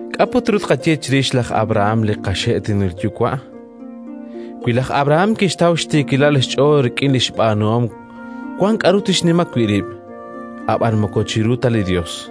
K'a' put ru tqaye chirix laj Abrahán li qaxe'toonil yuwa'? Wi laj Abrahán kixtaw xtiikilal xch'ool rik'in li xb'aanuhom, wank k'aru tixnima wi' rib', ab'anan moko chiru ta li Yos.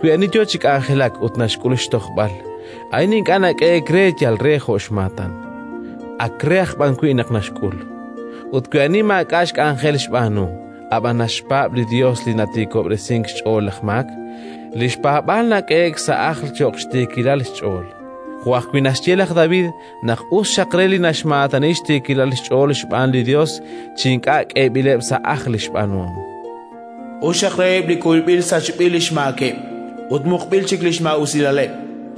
Wi ani yo chi k'anjelak ut naxk'ul xtojb'al, a'in ink'a' nak'ehe'k re yal jo' xmaatan, ak re aj b'an wi' naq naxk'ul. Ut wi ani maak'a' k'anjel xb'aanu, ab'an naxpaab' li Yos li natiikob'resink xch'ool laj maak, li xpaab'aal nak'ehe'k sa' ajl cho'q xtiikilal xch'ool. Jo' ajwi' naxye laj David naq us xaq re li naxmaatani xtiikilal xch'ool xb'aan li Yos chi ink'a' k'eeb'ileb' sa' ajl li xb'aanuhom: “Us xaq reheb' li kuyb'il sachb'il li xmaakeb', ut muqb'il chik li xmaa'usilaleb'.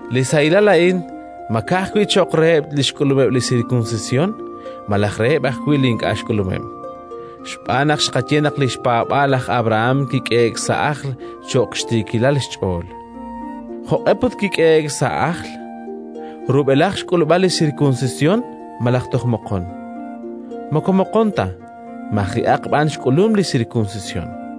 Li sahilal a'in ma ka'ajwi' cho'q reheb' li xk'ulumeb' li sirkunsisyon malaj reheb' ajwi' li ink'a' xk'ulumeb'? Xb'aan naq xqaye naq li xpaab'aal laj Abrahán kik'ehe'k sa' ajl cho'q xtiikilal xch'ool. Jo'q'e put kik'ehe'k sa' ajl? Rub'elaj xk'ulb'al li sirkunsisyon malaj toj moqon? Moko moqon ta, maji'aq b'an xk'ulum li sirkunsisyon: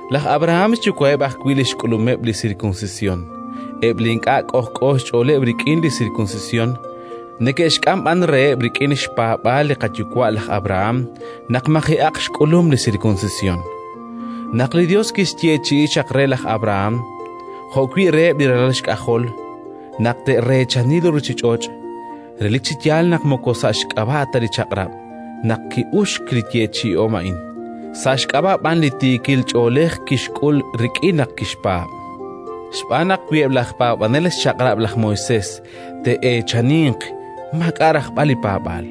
Laj Abrahán xyuwa'eb' ajwi' li xk'ulumeb' li sirkunsisyon, eb' li ink'a' k'ojk'o xch'ooleb' rik'in li sirkunsisyon, neke'xk'am b'an reheb' rik'in xpaab'aal li qayuwa' laj Abrahán naq maji'aq xk'ulum li sirkunsisyon. Naq li Yos kixyeechi'i chaq re laj Abrahán jo'wi' reheb' li ralal xk'ajol naq te'reechani li ruuchich'och', relik chi yaal naq moko sa' xk'ab'a' ta li Chaq'rab' naq ki'uxk li yeechi'om a'in, sa' xk'ab'a' b'an li tiikil ch'oolej kixk'ul rik'in naq kixpaab'. Xb'aan naq wi eb' laj paab'anel xChaq'rab' laj Moisés te'eechaninq, maak'a' rajb'al li paab'aal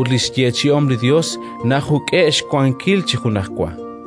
ut li xyeechi'om li Yos najuk'e'k xwankil chi junajwa.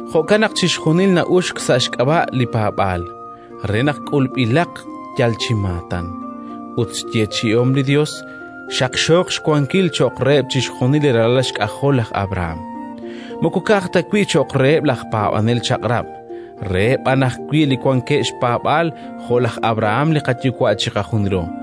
Jo'kan naq chixjunil na'uxk sa' xk'ab'a' li paab'aal re naq k'ulb'ilaq yal chi maatan, ut li xyeechi'om li Yos xaqxooq xwankil cho'q reheb' chixjunil li ralal xk'ajol laj Abrahán: moko ka'aj ta wi' cho'q reheb' laj paab'anel Chaq'rab', reheb' aj b'an wi' li wankeb' xpaab'aal jo' laj Abrahán li qayuwa' chiqajunilo,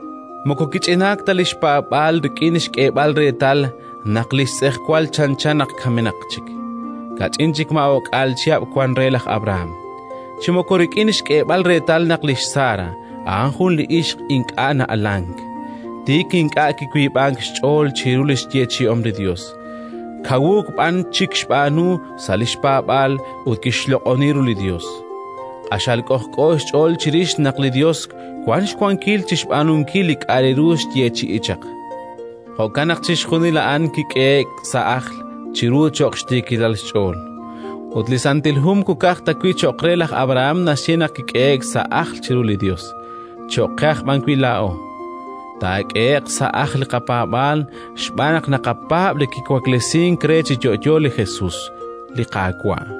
Moko kich'inank ta li xpaab'aal rik'in xk'eeb'al reetal naq li xtz'ejwal chanchan naq kamenaq chik (kach'in chik maa o'k'aal chihab' wank re laj Abrahán); chi moko rik'in xk'eeb'al reetal naq lix Sara a'an jun li ixq ink'a' na'alank. Tik ink'a' kiwiib'ank xch'ool chiru li xyeechi'om li Yos, kawuuk b'an chik kixb'aanu sa' li xpaab'aal ut kixloq'oni ru li Yos, q'axal k'ojk'o xch'ool chirix naq li Yos wank xwankil chi xb'aanunkil li k'aru kixyeechi'i chaq. Jo'kan naq chixjunil a'an kik'ehe'k sa' ajl chiru cho'q xtiikilal xch'ool. Ut li Santil Hu moko ka'aj ta wi' cho'q re laj Abrahán naxye naq kik'ehe'k sa' ajl chiru li Yos, cho'q qe aj b'an wi' laa'o. Taak'ehe'q sa' ajl li qapaab'aal xb'aan naq naqapaab' Li kiwaklesink re chi yo'yo li Jesus, li Qaawa'.